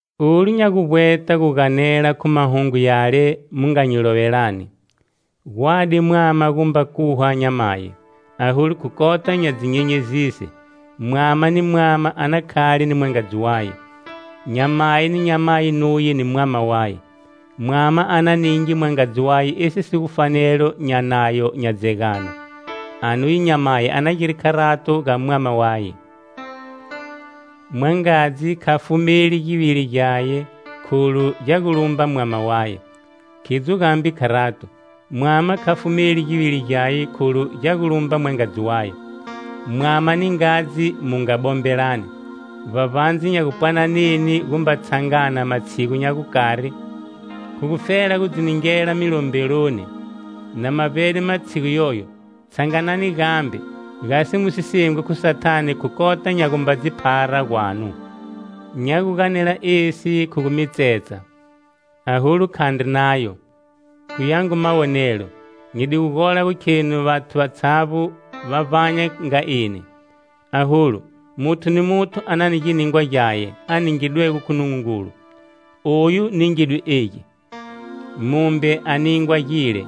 Olu nya gu vbweta gu ganela khu mahungu yale mu nga nyi lovelani: Gwadi mwama gumba khuha nyamayi. Aholu khu kota nya dzinyenyezise, mwama ni mwama a na khale ni mwangadzi waye, nyamayi ni nyamayi nuye ni mwama waye. Mwama a na ninge mwangadzi waye esi si gu fanelo nya nayo nya dzegano, anuye nyamayi a na gire kharato ga mwama waye. Mwangadzi kha fumeli givili gyaye kholu gya gu lumba mwama waye. Khidzo gambe kharato, mwama kha fumeli givili gyaye kholu gya gu lumba mwangadzi waye. Mwama ni ngadzi mu nga bombelani, vbavbandze nya gupwananeni gumba tshangana matshigu nya gukari, khu gufela gu dzi ningela milombeloni. Na ma vbede matshigu yoyo, tshanganani gambe, gasi mu si sengwi khu Sathane khu kota nya gumba dzi phara gwanu: Nya gu ganela esi khu gu mi tsetsa, aholu khandri nayo. Khu yangu mawonelo, nyi di gu gola gu kheni vathu vatshavbo va vbanya nga eni. Aholu, muthu ni muthu a na ni giningwa gyaye, a ningidwego khu Nungungulu: oyu ningidwe egi, mumbe a ningwa gile.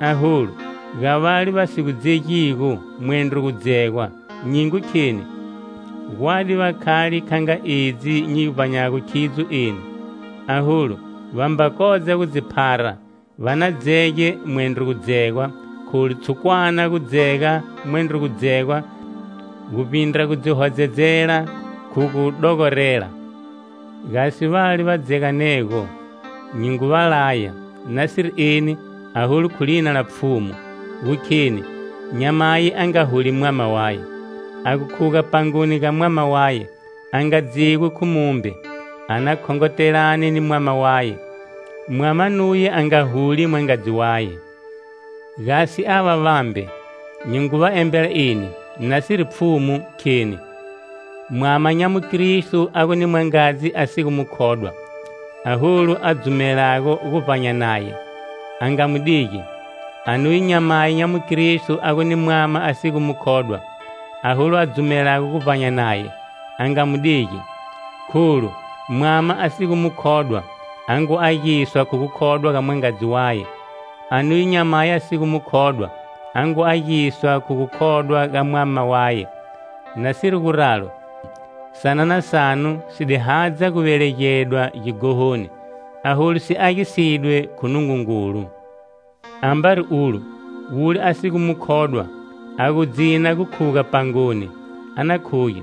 Aholu ga vale va si gu dzegigo mwendro gudzegwa nyi ngu kheni: Gwadi va khale kha nga edzi nyi vbanyago khidzo eni. Aholu, va mba kodza gu dzi phara, va na dzege mwendro gudzegwa kholu i tshukwana gudzega mwendro gudzegwa guvbindra gu dzi hodzedzela khu gu dogorela. Gasi vale va dzeganego, nyi ngu va laya, nasiri eni, aholu khu lina la Pfhumu, gu kheni, nyamayi a nga huli mwama waye. A gu khuga pangoni ga mwama waye, a nga dzegwi khu mumbe; a na khongotelane ni mwama waye. Mwama nuye a nga huli mwangadzi waye. Gasi ava vambe, nyi ngu va embela eni, nasiri Pfhumu, kheni: Mwama nya mukristo a gu ni mwangadzi a si gu mukhodwa, aholu a dzumelago gu vbanya naye, a nga mu digi. Anuye nyamayi nya mukristo a gu ni mwama a si gu mukhodwa, aholu a dzumelago gu vbanya naye, a nga mu digi. Kholu, mwama a si gu mukhodwa a ngu agiswa khu gukhodwa ga mwangadzi waye. Anuye nyamayi a si gu mukhodwa a ngu agiswa khu gukhodwa ga mwama waye. Nasiri guralo, sanana sanu si di hadza gu velegedwa gighohoni, aholu si agisidwe khu Nungungulu. Ambari ulo, wule a si gu mukhodwa, a gu dzina gu khuga pangoni, a na khuge.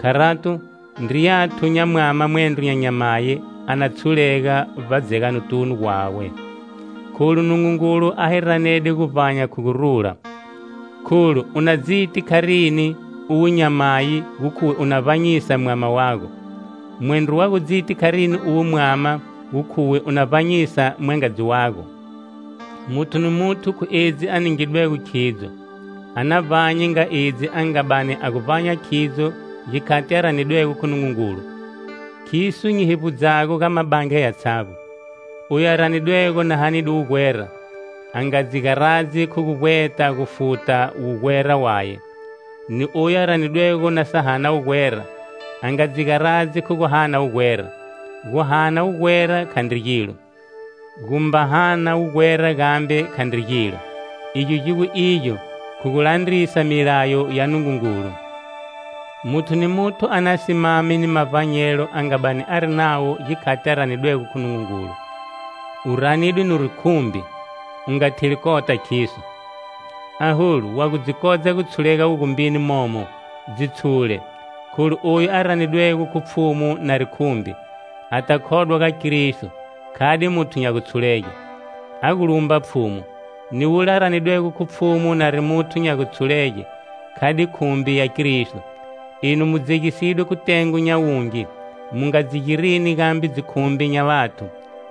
Kharato, ndriyathu nya mwama mwendro nya nyamani a na tshulega vbadzeganotunu gwawe, kholu Nungungulu a hi ranede guvbanya khu gurula. Kholu u na dziti kharini, uwe nyamayi, gu khuwe u na vbanyisa mwama wago? Mwendro wa gu dziti kharini uwe mwama gu khuwe u na vbanyisa mwangadzi wago? Muthu ni muthu khu edzi a ningidwego khidzo, a na vbanye nga edzi a nga bani a gu vbanya khidzo gikhati a ranidwego khu Nungungulu. Khiso nyi hevbudzago ga mabandla yatshavbo. Oyu a ranidwego na hanide wugwera, a nga dzi garadzi khu gu vbweta gu futa wugwera waye. Ni oyu a ranidwego na sa hana wugwera, a nga dzi garadzi khu gu hana wugwera. Guhana wugwera khandri gilo, gumba hana wugwera gambe khandri gilo. Igyo gi gu igyo khu gu landrisa milayo ya Nungungulu. Muthu ni muthu a na simame ni mavbanyelo a nga bani ari nawo gikhati a ranidwego khu Nungungulu. U ranidwe nuri khumbi? U nga theli kota khiso. Aholu, wa gu dzi kodza gu tshulega wugumbini momo, dzi tshule. Kholu oyu a ranidwego khu Pfhumu nari khumbi, ata khodwa ga Kristo, khade muthu nya gutshulege; a gu lumba Pfhumu. Ni wule a ranidwego khu Pfhumu nari muthu nya gutshulege, khade khumbi ya Kristo. Enu mu dzegisidwe khu tengo nya wungi; mu nga dzi girini gambe dzikhumbi nya vathu.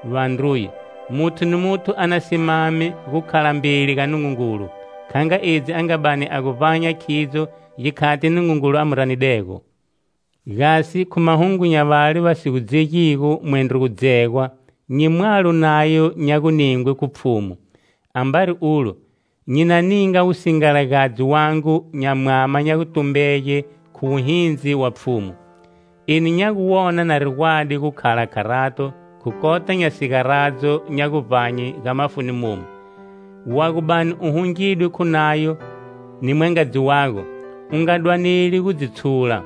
Vandruye, muthu ni muthu a na simame gukhala mbeli ga Nungungulu kha nga edzi a nga bani a gu vbanya khidzo gikhati Nungungulu a mu ranidego. Gasi khu mahungu nya vale va si gu dzegigo mwendro gudzegwa nyi mwalo nayo nya guningwe khu Pfhumu. Ambari ulo, nyi na ninga wusingalagadzi wangu nya mwama nya gutumbege khu wuhindzi wa Pfhumu. Eni nya gu wona nari gwadi gukhala kharato khu kota nya sigaradzo nya guvbanye ga mafuni momu. Wa gu bani wu hungidwe khu nayo ni mwangadzi wago, u nga dwaneli gu dzi tshula.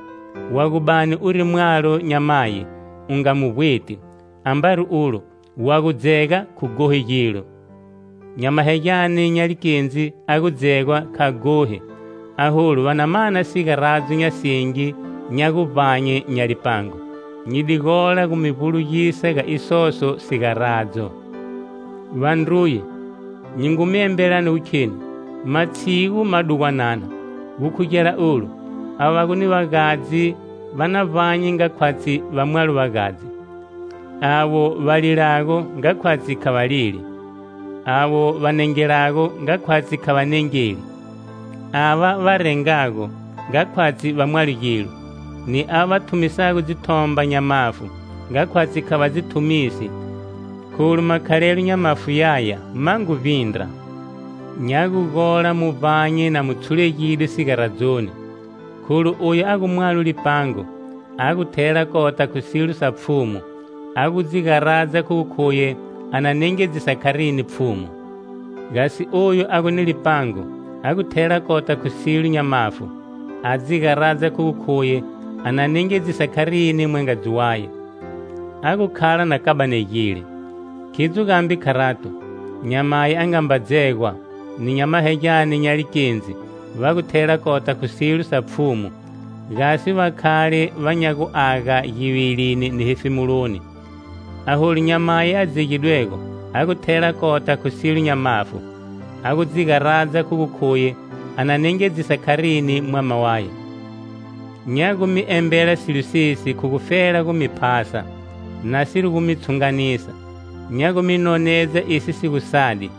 Wa gu bani uri mwalo nyamayi; u nga mu vbweti. Ambari ulo, wa gu dzega khu ghohi gilo. Nyamahegyane nya likendzi a gu dzegwa kha ghohi. Aholu va na mana sigaradzo nya singi nya guvbanye nya lipango. Nyi di gola gu mi vbulugisa ga isoso sigaradzo. Vandruye, nyi ngu mi embelani gu kheni, matshigu madugwanana. Gukhugela olu, ava va gu ni vagadzi va na vbanye nga khwatshi va mwalo vagadzi; avo va lilago nga khwatshi kha va lili; avo va nengelago nga khwatshi kha va nengeli; ava va rengago, nga khwatshi va mwalo gilo; ni ava va thumisago dzithomba nya mafu, nga khwatshi kha va dzi thumisi. Kholu makhalelo nya mafu yaya ma ngu vbindra. Nya gu gola mu vbanye na mu tshulegide sigaradzoni. Kholu oyu a gu mwalo lipango, a gu thela kota khu silo sa Pfhumu, a gu dzi garadza khu gu khuye a na nengedzisa kharini Pfhumu. Gasi oyo a gu ni lipango, a gu thela kota khu silo nya mafu, a dzi garadza khu gu khuye a na nengedzisa kharini mwangadzi waye. A gu khala na kabanegile. Khidzo gambe kharato, nyamayi a nga mba dzegwa, ni nyamahegyane nya likendzi va gu thela kota khu silo sa Pfhumu gasi va khale va nya guaga givilini ni hefemuloni. Aholu nyamayi a dzegidwego a gu thela kota khu silo nya mafu, a gu dzi garadza khu gu khuye a na nengedzisa kharini mwama waye. Nya gu mi embela silo sesi khu gufela gu mi phasa, nasiri gu mi tshunganisa. Nya gu mi nonedza esi si gu sadi,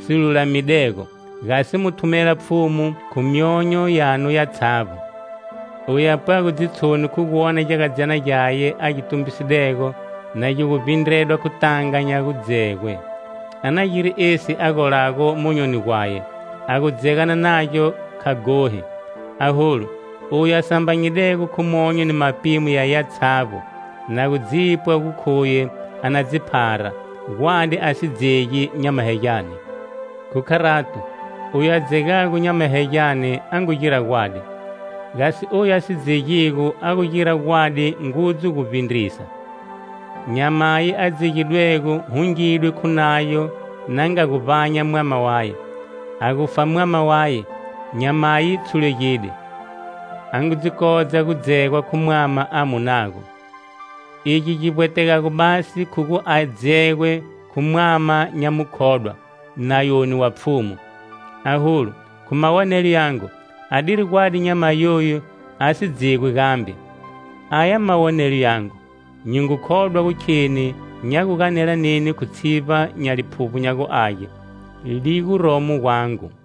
si lulamidego, gasi mu thumela Pfhumu khu myonyo yanu yatshavbo. Oyu a pwago dzitshoni khu gu wona gyagadzyana gyaye a gi tumbisidego na gi gu vbindredwa khu tanga nya gu dzegwe, a na gire esi a golago monyoni gwaye; a gu dzegana nagyo kha ghohi. Aholu, oyu a sambanyidego khu monyo ni mapimo yaye yatshavbo, na gu dzipwa gu khuye a na dzi phara, gwadi a si dzegi nyamahegyane. Khu kharato, Oyu a dzegago nyamahegyane a ngu gira gwadi; gasi oyu a si dzegigo a ngu gira gwadi ngudzu guvbindrisa. Nyamayi a dzegidwego hungidwe khu nayo na nga gu vbanya mwama waye. A gufa mwama waye, nyamayi tshulegide; a ngu dzi kodza gu dzegwa khu mwama a munago. Egi gi vbwetegago basi khu gu a dzegwe khu mwama nya mukhodwa, nayoni wa Pfhumu. Aholu, khu mawonelo yangu, adiri gwadi nyamayi yoyu a si dzegwi gambe. Aya mawonelo yangu; nyi ngu khodwa gu kheni nya gu ganela neni khu tshivba nya Liphuvbo nya gu Age, li guromo gwangu.